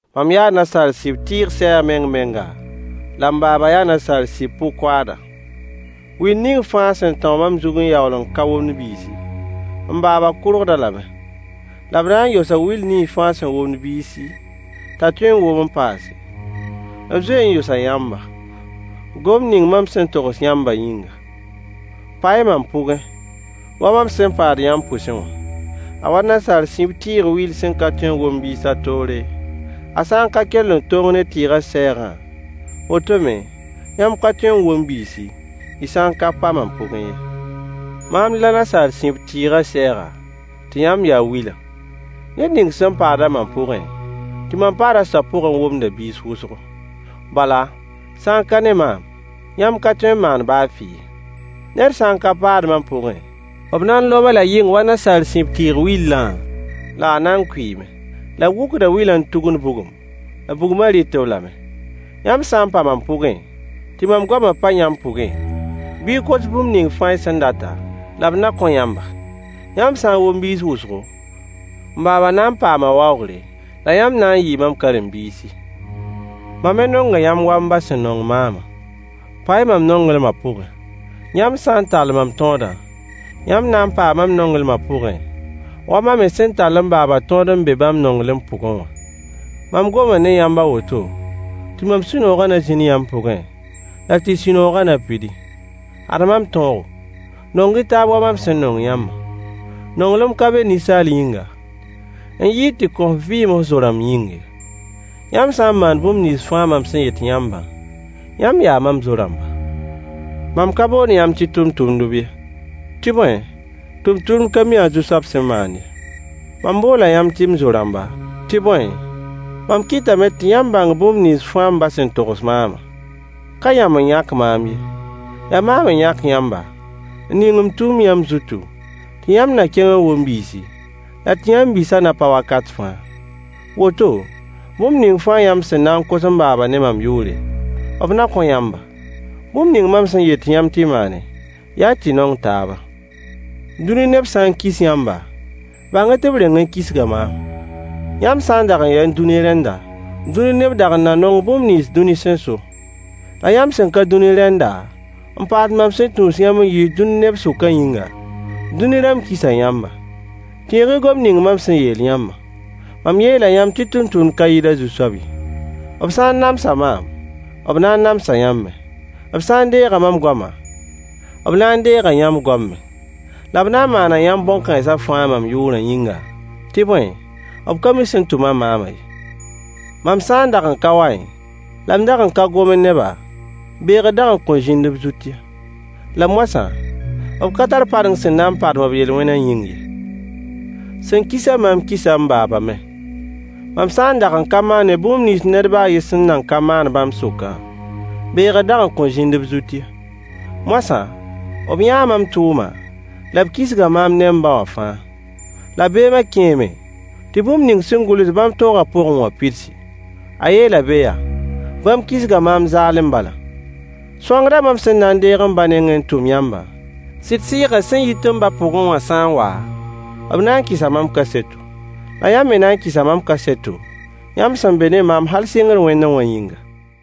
Mam yaa nasaar sib tɩɩg sɛɛg meng-menga, la m baaba yaa nasaar sib pʋ-koaada. Will ning fãa sẽn tão mam zug n yaool n ka womd biisi, m baaba kʋrgd-a lame. La b na n yosa will ning fãa sẽn womd biisi, t'a tõe n wom n paase. B zoe n yosa yãmba, gomd ning mam sẽn togs yãmbã yĩnga. Pa-y mam pʋgẽ, wa mam sẽn paad yãmb pʋsẽ wã. A wa nasaar sib tɩɩg will sẽn ka tõe n wom biis a toore, a sã n ka kell n tong ne tɩɩgã sɛɛgã, woto me, yãmb ka tõe n wom biisi, y sã n ka pa mam pʋgẽ ye. Maam la nasaar sib tɩɩgã sɛɛga, tɩ yãmb ya wilã. Ned ning sẽn paad mam pʋgẽ, tɩ mam paad a soab pʋgẽ womda biis wʋsgo. Bala, sã n ka ne maam, yãmb ka tõe n maan baa fɩ ye. Ned sã n ka paad mam pʋgẽ, b na n lob-a-la yɩng wa nasaar sib tɩɩg willã, la a na n kʋɩɩme. La b wʋkda wilã n tugund bugum, la bugmã rɩt-b lame. Yãmb sã n pa mam pʋgẽ, tɩ mam goamã pa yãmb pʋgẽ, bɩ y kos bũmb ning fãa y sẽn data, la b na kõ yãmba. Yãmb sã n wom biis wʋsgo, m baaba na n paama waoogre, la yãmb na n yɩɩ mam karen-biisi. Mam me nonga yãmb wa m ba sẽn nong maamã. Pa-y mam nonglmã pʋgẽ. Yãmb sã n tall mam tõodã, yãmb na n paa mam nonglmã pʋgẽ, wa mam me sẽn tall m baaba tõod n be bãmb nonglem pʋgẽ wã. Mam goma ne yãmb a woto, tɩ mam sũ-noogã na zĩnd yãmb pʋgẽ, la tɩ y sũ-noogã na pidi. Ad mam tõogo: Nong-y taab wa mam sẽn nong yãmbã. Nonglem ka be ninsaal yĩnga, n yɩɩd tɩ kõ f vɩɩm f zo-rãmb yĩng ye. Yãmb sã n maan bũmb nins mam sẽn yet yãmbã, yãmb yaa mam zo-rãmba. Mam ka boond yãmb tɩ tʋmtʋmdb ye, tɩ bõe, tʋmtʋmd ka mi a zu-soab sẽn maand ye. Mam boola yãmb tɩ m zo-rãmba, tɩ bõe, mam kɩtame tɩ yãmb bãng bũmb nins fãa m ba sẽn togs maamã. Ka yãmb n yãk maam ye, yaa maam n yãk yãmba, n ning m tʋʋmd yãmb zutu, tɩ yãmb na kẽng n wom biisi, la tɩ yãmb biisã na pa wakat fãa. Woto, bũmb ning fãa yãmb sẽn na kos m baaba ne mam yʋʋre, b na kõ yãmba. Bũmb ning mam sẽn yet yãmb tɩ y maane, yaa tɩ y nong taaba. Dũni neb sã n kis yãmba, bãng-y tɩ b reng n kisga maam. Yãmb sã n dag n ya dũni rẽnda, dũni neb dag n na nong bũmb nins dũni sẽn so. La yãmb sẽn ka dũni rẽnda, n paas mam sẽn tũus yãmb n yiis dũni neb sʋkã yĩnga, dũni rãmb kisa yãmba. Tẽeg-y gomd ning mam sẽn yeel yãmbã. Mam yeela yãmb tɩ tʋmtʋmd ka yɩɩd a zu-soab ye. B sã n namsa maam, b na n namsa yãmb me. B sã n deega mam goama, b na n deega yãmb goam me. La b na n maana yãmb bõn-kãensã fãa mam yʋʋrã yĩnga, tɩ bõe, b ka mi sẽn tʋm-a maamã ye. Mam sã n dag n ka waẽ, la m dag n ka gomẽ ne-ba, beegr dag n kõn zĩnd b zut ye. La moasã, b ka tar padeng sẽn na n padem b yel-wẽnã yĩng ye. Sẽn kis-a maam kisa m baaba me. Mam sã n dag n ka maanẽ tʋʋm nins ned baa a yen sẽn nan ka maan bãmb sʋkã, beegr dag n kõn zĩnd b zut ye. Moasã, b yãa mam tʋʋmã, la b kisga maam ne m ba wã fãa. La beemã kẽeme, tɩ bũmb ning sẽn gʋls bãmb tõogã pʋgẽ wã pidsi. A yeela be yaa: “Bãmb kisga maam zaalem bala.” Sõangdã mam sẽn na n deeg m ba nengẽ n tʋm yãmbã, sɩd Sɩɩgã sẽn yit m ba pʋgẽ wã sã n wa, b na n kɩsa mam kaseto, la yãmb me na n kɩsa mam kaseto, yãmb sẽn be ne maam hal sɩngr wẽndẽ wã yĩnga.